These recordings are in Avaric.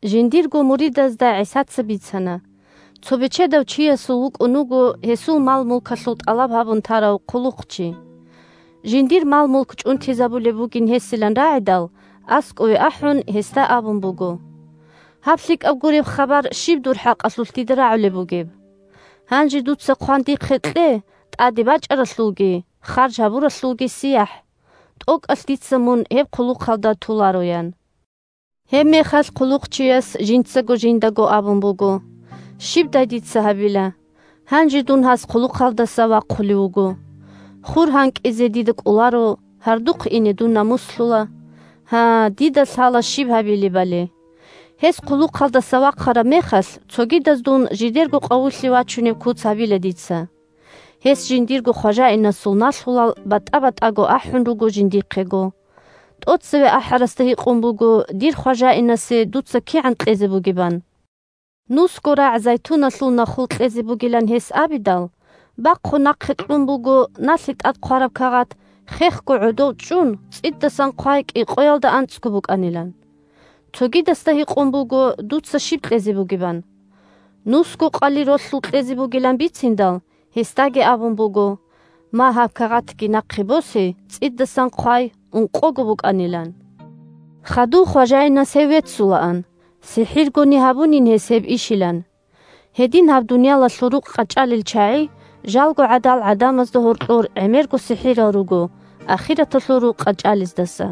Жиндирго муридазда ГӀисаца бицана: – Цо бечедав чиясул вукӀун вуго гьесул мал-мулкалъул тӀалаб гьабун тарав хъулухъчи. Жиндир мал-мулк чӀунтизабулеб бугин гьесилан рагӀидал, аскӀове ахӀун, гьесда абун буго: «Гьаб лъикӀаб гуреб хабар щиб дур хӀакъалъулъ дида рагӀулеб бугеб? Гьанже дуца хъван кье дихъе тӀаде бачӀаралъулги харж гьабуралъулги сияхӀ. ТӀокӀалъ дица мун гьеб хъулухъалда толаро», – ян. Гьебмехалъ хъулухъчияс жинцаго жиндаго абун буго: «Щибдай дица гьабила? Гьанже дун гьас хъулухъалдаса вахъулев вуго. Хур гьанкӀизе дида кӀоларо, гьардухъ ине дун намуслъула. Гьа, дида лъала щиб гьабилебали. Гьес хъулухъалдаса вахъараб мехалъ цогидаз дун жидерго къавулъе вачунеб куц гьабила дица». Гьес жиндирго хважаинасул налъулал батӀа-батӀаго ахӀун руго жиндихъего. ТӀоцеве ахӀарасда гьикъун буго дир хважаинасе дуца кигӀан кьезе бугебан. Нусго рагӀ зайтуналъул нахул кьезе бугилан гьес абидал, бахъун нахъе кьун буго налъи тӀад хъвараб кагъат: «Хехго гӀодов чӀун цӀидасан хъвай кӀикъоялда анцӀго букӀанилан». Цогидасда гьикъун буго дуца щиб кьезе бугебан. Нусго къали ролъул кьезе бугилан бициндал, гьесдаги абун буго: «Ма гьаб кагъатги нахъе босе, цӀидасан хъвай ункъого букӀанилан». Хадув хважаинас гьев веццулаан, сихӀиргони гьабунин гьес гьеб ишилан. Гьедин гьаб дуниялалъул рукъ къачӀалел чагӀи жалго гӀадал гӀадамазда гьоркьор гӀемерго сихӀирал руго, ахираталъул рукъ къачӀалездаса.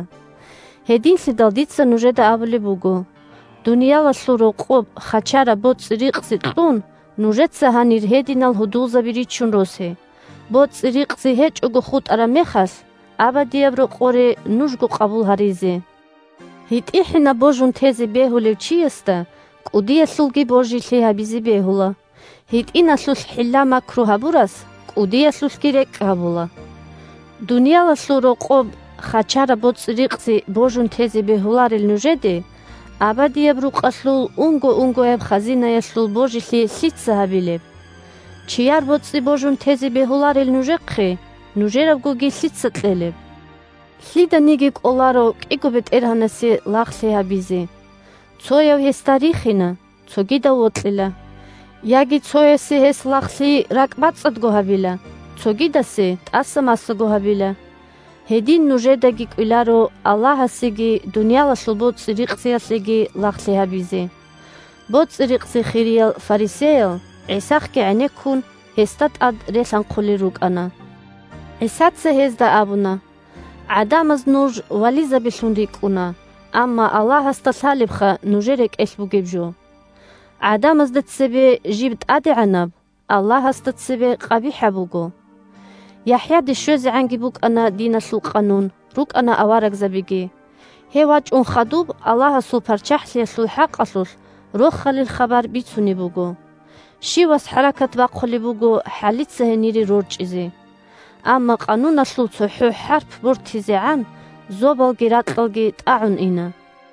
Гьединлъидал дица нужеда абулеб буго: дуниялалъул рокъоб хачараб боцӀи-рикъзи кьун, нужеца гьанир гьединал гьудулзаби ричун росе, боцӀи-рикъзи гьечӀого хутӀараб мехалъ, абадияб рокъоре нужго къабул гьаризе. ГьитӀихӀинаб божун тезе бегьулев чиясда кӀудиялъулги божилъи гьабизе бегьула. ГьитӀиналъулъ хӀилла-макру гьабурас кӀудиялъулъги рекӀкӀ гьабула. Дуниялалъул рокъоб хачараб боцӀи-рикъзи божун тезе бегьуларел нужеде абадияб рукъалъул унго-унгояб хазинаялъул божилъи лъица гьабилеб? Чияр боцӀи божун тезе бегьуларел нужехъе, нужерабгоги лъица кьелеб? Лъиданиги кӀоларо кӀиго бетӀергьанасе лагълъи гьабизе. Цояв гьесда рихина, цогидав вокьила. Яги цоясе гьес лагълъи ракӀбацӀцӀадго гьабила, цогидасе тӀаса-масаго гьабила. Гьедин нужедаги кӀвеларо Аллагьасеги дуниялалъул боцӀи-рикъзиялъеги лагълъи гьабизе. БоцӀи-рикъзи хириял фарисеял, ГӀисахъги гӀенеккун, гьесда тӀад релъанхъулел рукӀана. ГӀисаца гьезда абуна: – ГӀадамаз нуж вализабилъун рикӀкӀуна, амма Аллагьасда лъалебха нужер рекӀелъ бугеб жо. ГӀадамазда цебе жиб тӀадегӀанаб, Аллагьасда цебе къабихӀаб буго. ЯхӀяде щвезегӀанги букӀана диналъул къанун, рукӀана аварагзабиги. Гьев вачӀун хадуб Аллагьасул ПарччахӀлъиялъул хӀакъалъулъ Рохалил хабар бицунеб буго. Щивас хӀаракат бахъулеб буго хӀалица гьенире рорчӀизе. Амма къануналъул цохӀо хӀарп бортизегӀан, зобалги ракьалги тӀагӀун ина.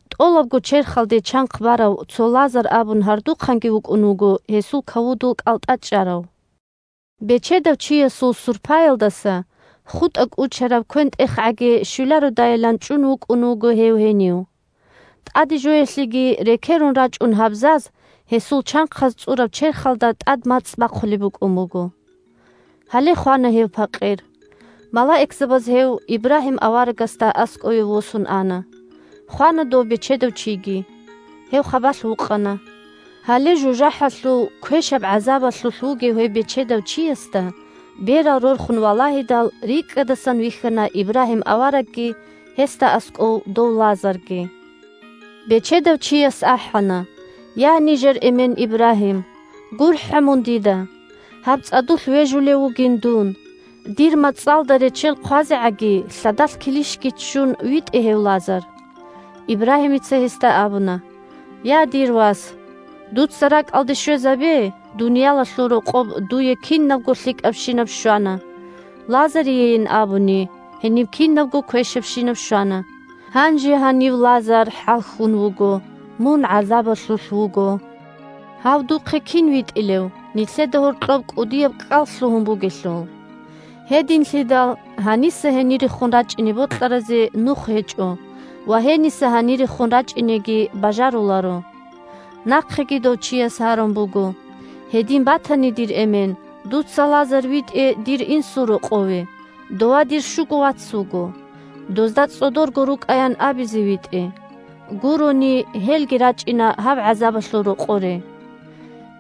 ТӀолабго черхалде чанхъ барав цо Лазар абун гьардухъанги вукӀун вуго гьесул кавудул кӀалтӀа чӀарав. Бечедав чиясул сурпаялдаса хутӀа-кӀучараб квен-тӀехгӀаги щвелародайилан чӀун вукӀун вуго гьев гьенив. ТӀадежоялъеги рекерун рачӀун гьабзаз гьесул чанхъаз цӀураб черхалда тӀад мацӀ бахъулеб букӀун буго. Гьале, хвана гьев пакъир, малаикзабаз гьев Ибрагьим аварагасда аскӀове восун ана. Хвана дов бечедав чиги. Гьев хабалъ вукъана. Гьале жужахӀалъув квешаб гӀазабалъулъ вугев гьев бечедав чиясда, берал рорхун валагьидал, рикӀкӀадасан вихьана Ибрагьим аварагги гьесда аскӀов дов Лазарги. Бечедав чияс ахӀана: «Я, нижер эмен Ибрагьим! ГурхӀа мун дида! Гьаб цӀадулъ вежулев вугин дун, дир мацӀалда реччел хъвазегӀаги, лъадалъ килищги ччун, витӀе гьев Лазар». Ибрагьимица гьесда абуна: «Я, дир вас, дуца ракӀалде щвезабе: дуниялалъул рокъоб дуе кинабго лъикӀабщинаб щвана, Лазариейин абуни гьениб кинабго квешабщинаб щвана. Гьанже гьанив Лазар хӀалхьун вуго, мун гӀазабалъулъ вуго. Гьав духъе кин витӀилев, нилъеда гьоркьоб кӀудияб кӀкӀал лъугьун бугелъул. Гьединлъидал гьаниса гьенирехун рачӀине бокьаразе нух гьечӀо ва гьениса гьанирехун рачӀинеги бажаруларо». Нахъеги дов чияс гьарун буго: «Гьедин батани, дир эмен, дуца Лазар витӀе дир инсул рокъове. Дова дир щуго вац вуго. Дозда цӀодорго рукӀаян абизе витӀе. Гурони – гьелги рачӀина гьаб гӀазабалъул рокъоре».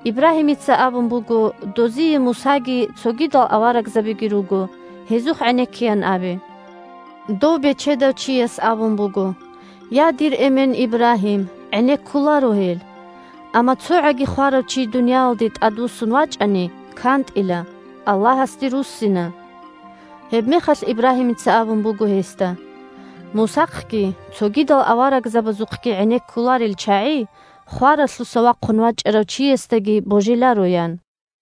Ибрагьимица абун буго: «Дозие Мусаги цогидал аварагзабиги руго. Гьезухъ гӀенеккеян абе». Дов бечедав чияс абун буго: «Я, дир эмен Ибрагьим, гӀенеккуларо гьел! Амма цогӀаги хварав чи дуниялалде тӀадвуссун вачӀани – кантӀила, Аллагьасде руссина». Гьебмехалъ Ибрагьимица абун буго гьесда: «Мусахъги цогидал аварагзабазухъги гӀенеккуларел чагӀи хваралъуса вахъун вачӀарав чиясдаги божиларо», – ян.